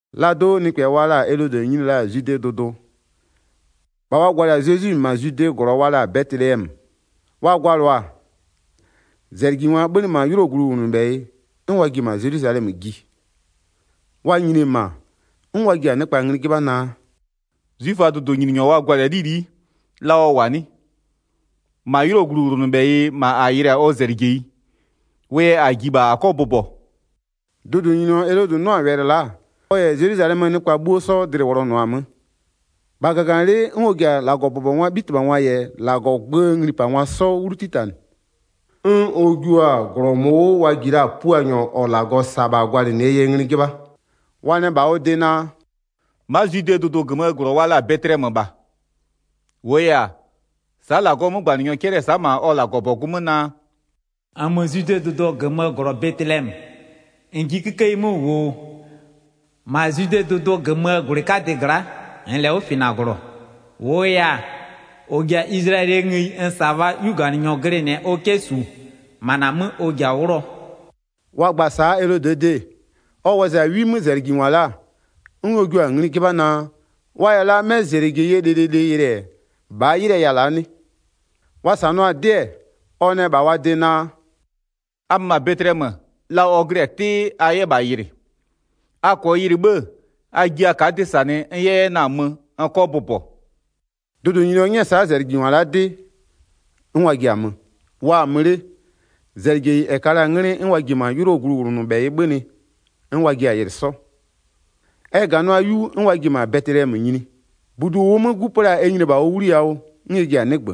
Laa do'o nɩkpɛ wa la-a Elodɩ nyini la-a Zwidee dʋdʋ, -bha wa gwalɩ-a Zezwi -ma Zwidee -glɔ wa la-a Bɛtɩlɛmö. Wa gwalɩɔ-a, -zɛlɩjingwa 'bhönɩ-ɛ -ma 'ylʋɔ gluwlʋnʋbhɛyɩ 'n wa ji-e -ma Zelwizalɛmö ji. Wa nyini-e -ma, 'n wa ji-a nɩkpa ngli 'jɩbha naa: “'Zwiföaa dʋdʋnyininyɔ wa gwalɩ-a 'lili'i, la ɔ -wʋ-a 'nɩ? -Ma 'ylʋɔ gluwlʋnʋbhɛyɩ -ma -a yɩlɩ-a ɔ -zɛlɩjeyi, wʋ yɛ -a ji -bha -a 'kɔ bʋbɔ.” Dʋdʋnyininyɔ Elodɩ 'nʋ-a wɛlɩ la'a, ɔ -yɛ Zelwizalɛmöö nɩkpa 'bhuo 'sɔ dlɩ-ɩ wʋlɔnʋʋa-a 'mö. 4-Bha -gaganɩlɩ'ɩ 'n ɔ ji-a -Lagɔbʋbɔngwaa 'bhitɩbhangwa -yɛ -Lagɔɔ gböö nglipangwa 'sɔ 'wlu 'titanɩ, 'n ɔ jua-a -glɔ -mʋʋ 'wʋ wa ji la-a Puanyɔ -ɔ -Lagɔ -sa-a -bha gwalɩnɩɛ yɛ ngli 'jɩbha. Wa nɛ -bha ɔ de naa: “Ma'a Zwidee dʋdʋ -gömöö -glɔ wa la-a Bɛtɩlɛmö -bha. -Wʋʋ yɛ-a, sa'a -Lagɔɔ 'mögbanɩnyɔ 'cɛlɩ-ɛ sa'a -ma ɔ -Lagɔbɔgʋ 'mö naa: 6-Nmö Zwidee dʋdʋ -gömöö -glɔ Bɛtɩlɛmö, -n ji 'kikeyi 'mö -wʋ oo, -ma Zwidee dʋdʋ -gömöö -gwlɩ 'kadɩ gla'a -nn -lɛ 'wʋfɩnaglɔ. -Wʋʋ yɛ-a, -ɔ ji-a Izlayɛlɩɛ ngëyi n -sa-a -bhaa 'yuganɩnyɔ glɩnɩɛ ɔ 'kɛ -su, -ma -na 'mö ɔ ji-a 'wlʋɔ.” Wa gba-a sa'a Elodɩɛ de-e, ɔ wɔzɩ-a 'wi 'mö -zɛlɩjingwa la'a 'n ɔ jua-a ngli 'jɩbha naa, wa -yɛ la 'mɛ -zɛlɩjeyie lɩlɩlɩ yɩlɩ, -bhaa 'ylɩɛ ya-a la'a 'nɩ? Wa -sanɩɔ-a 'dɩ-ɛ, ɔ nɛ -bha wa de naa: “A mö -ma Bɛtɩlɛmö, la ɔ glɩ-a 'tɩɩ a 'yɛ -bha yɩlɩ. A -kɔɔ yɩlɩ 'bhë-ë, a ji a ka'a 'dɩ -sanɩ n 'yɛ 'yɛ na-a mö n 'kɔ bʋbɔ.” Dʋdʋnyininyɔ 'nyɛ-ɛ sa'a -zɛlɩjingwa la'a 'dɩ, 'n wa ji-a mö. Wa-a 'mö 'le, -zɛlɩjeyi -ɛ ka la-a 'nglɩ 'n wa ji-e -ma 'ylʋɔ gluwlʋnʋbhɛyɩ 'bhönɩ, 'n wa jiɛ-a yɩlɩ 'sɔ. Ɛ -ganʋa 'yu 'n wa ji-e -ma Bɛtɩlɛmö nyini. -Budu -ʋʋ 'mö 'gu pö la-a ɛ nyini-e -bha ʋ 'wliyawʋ, 'n ɛ ji-a 'nɩgbö.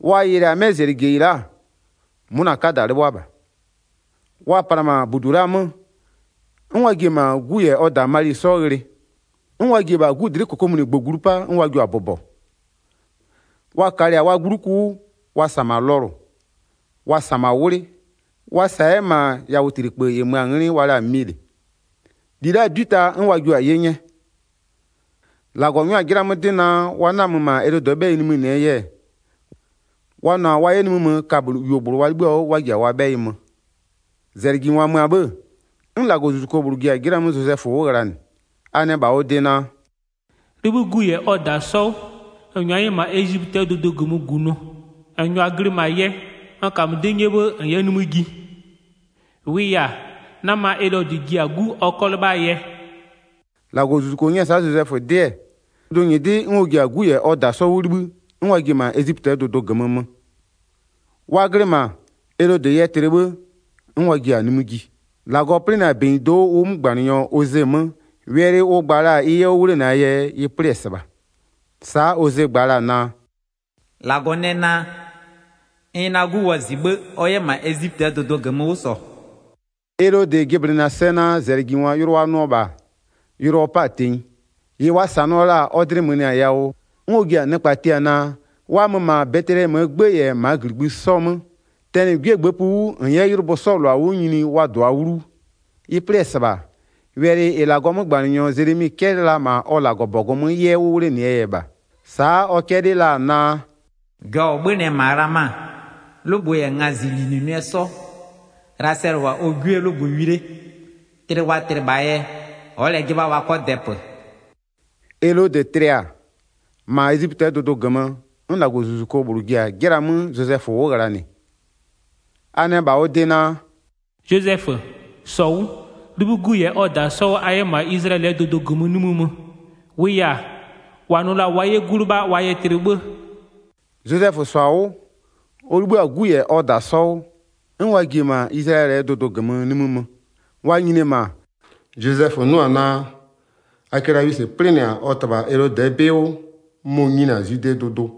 Wa yɩlɩ-a 'mɛ -zɛlɩjeyi la'a, 'mʋna 'kada 'lɩbhʋa -bha. Wa pla-a -ma -budu la'aa 'mö, 'n wa ji-e -ma 'gu -yɛ ɔ -da Mali 'sɔ ghlɩ. 'N wa ji-e -bha 'gu dlɩ'ɩ -kokomunigbö glu 'pa, 'n wa jio-a bʋbɔ. Wa kalɩ-a wa 'gbluku 'wʋ, wa -sa -ma lɔlʋ, wa -sa -ma 'wlɩ, wa -sa 'yɛ -ma yatlikpö -ɩ mö-a 'nglɩ wa la-a milɩ, -li la'aa 'dwi ta 'n wa jio-a 'ye 'nyɛ. 12-Lagɔ 'nyʋa-a 'jɩla 'mö 'dɩ naa, wa 'na-a mö -ma Elodɩɛ 'bhɛyɩ nimï -nɩɛ yɛ, wa nʋ-a wa 'yɛ nimï mö kaböyuogblʋ wa 'libhï-a 'wʋ 'n wa ji-a wa 'bhɛyɩ mö. Zezwie -lowlengwa yɛ -ma Ezipötɩɛ dʋdʋ -gömö -gunʋ 13-Zɛlɩjingwa mö-a 'bhë, 'n -Lagɔzuzuko -bhlʋ ji-a 'jɩla 'mö Zozɛfö 'wʋ ghlanɩ, a nɛ -bha ɔ de naa: “'Libhï 'gu -yɛ ɔ -da 'sɔ 'wʋ -n -nyʋa 'yɛ -ma Ezipötɩɛ dʋdʋ -gömö -gunʋ. -N -nyʋa glɩ -ma yɛ, n -kamö 'dɩ 'nyɛ 'sɔ 'bhë a 'yɛ nimï ji. -Wʋʋ yɛ-a, 'nama Elodɩ ji-a 'gu ɔ 'kɔ 'lɩbhaa yɛ.” 14-Lagɔzuzuko 'nyɛ-ɛ sa'a Zozɛfö 'dɩ-ɛ, dʋdʋnyɩdɩ 'n ɔ ji-a 'gu -yɛ ɔ -da 'sɔ 'wʋ 'libhï, 'n wa ji-e -ma Ezipötɩɛ dʋdʋ -gömö mö. Wa glɩ -ma, Elodɩ yɛ tlɩ 'bhë 'n wa ji-a nimï ji. -Lagɔ 'plɩnɩ-a -benyido'o ʋ 'mögbanɩnyɔ Oze 'mö, wɛlɩ ʋ gba la-a ɩ 'yɛ 'wʋ 'wlenɩɛ yɛ ɩ 'plɩ-ɛ -sɩbha. Sa'a Oze gba la-a naa: “-Lagɔ nɛ naa: N yɛ na 'gu wɔzɩ 'bhë ɔ 'yɛ -ma Ezipötɩɛ dʋdʋ -gömö 'wʋ -sɔ.” Elodɩ jɩblɩnɩ-a sɛ naa -zɛlɩjingwa yʋlʋ wa nʋɔ -bha, yʋlʋ ɔ 'pa-a tenyi, -ɩ wa -sanɩɔ la-a ɔ dlɩ mönɩɩ-a yawʋ, 'n ɔ ji-a nɩkpa tia naa, wa mö -ma Bɛtɩlɛmöö 'gbë -yɛ -maa -gligbï 'sɔ 'mö, tɛnɩ 'gwie -gbëëpï 'wʋ -n 'yɛ 'ylʋbö 'sɔɔ -lʋa 'wʋ nyini wa -dʋa 'wlu 'wʋ. Ɩ 'plɩ-ɛ -sɩbha, wɛlɩ -ɩ -Lagɔɔ 'mögbanɩnyɔ Zelemi 'cɛlɩ la-a -ma ɔ -Lagɔbɔgʋ 'mö 'yɛ 'wʋ 'wlenɩɛ yɛ -bha. Sa'a ɔ 'cɛlɩɩ la-a naa: “Jɔ-ɔ 'bhönɩ-ɛ -ma Ghlama, 'lʋgbʋ -yɛ ngazɩlinʋnʋɩɛ 'sɔ, Ghlasɛlɩ -wʋ-a ɔ 'gwiee 'lʋgbʋ wi 'le. Tlɩ wa tlɩ -bhaa yɛ ɔ'ɔ -lɛ 'jɩbha wa 'kɔ dɛpö.” Elodɩ tlɩ-a, -ma Ezipötɩɛ dʋdʋ -gömö 'n -Lagɔzuzuko -bhlʋ ji-a 'jɩla 'mö Zozɛfö 'wʋ ghlanɩ. A nɛ -bha ɔ de naa: “Zozɛfö, -sɔ 'wʋ, 'libhï 'gu -yɛ ɔ -da 'sɔ 'wʋ a 'yɛ -ma Izlayɛlɩɛ dʋdʋ -gömö nimï mö, -wʋʋ yɛ-a, -wa nʋ la-a wa 'yɛ 'gu 'lɩbha wa yɛ tlɩ 'bhë.” Zozɛfö -sɔ-a 'wʋ, ɔ 'libhï-a 'gu -yɛ ɔ -da 'sɔ 'wʋ, 'n wa ji-e -ma Izlayɛlɩɛ dʋdʋ -gömö nimï mö. Wa nyini-e -ma, Zozɛfö 'nʋ-a naa, Akelawisɩ 'plɩnɩ-a ɔ -tɩbha Elodɩɛ 'bɩ 'wʋ mɔ-ɔ nyini-a Zwidee dʋdʋ,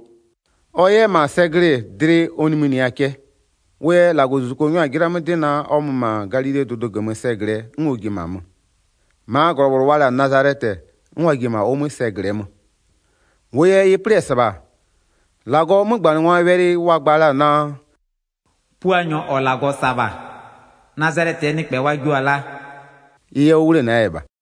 ɔ 'yɛ -ma sɛ glɩ-ɩ dlɩ ɔ nimïnɩɩ-a cɛ. Wʋ yɛ -Lagɔzuzuko 'nyɔ-a 'jɩla 'mö 'dɩ naa, ɔ mö -ma Galilee dʋdʋ -gömö sɛ -glɩɛ, 'n ɔ ji-e -ma mö. 23-Maa -glɔ -bhlʋ wa la-a Nazalɛtɩ, 'n wa ji-e -ma ʋ 'mö sɛ -glɩɛ mö. -Wʋʋ yɛ ɩ 'plɩ-ɛ -sɩbha, -Lagɔɔ 'mögbanɩngwaa wɛlɩ wa gba la-a naa: “Puanyɔ -ɔ -Lagɔ -sa-a -bha, Nazalɛtɩɛ nɩkpɛ wa jio-a laa,” ɩ 'yɛ 'wʋ 'wlenɩɛ yɛ -bha.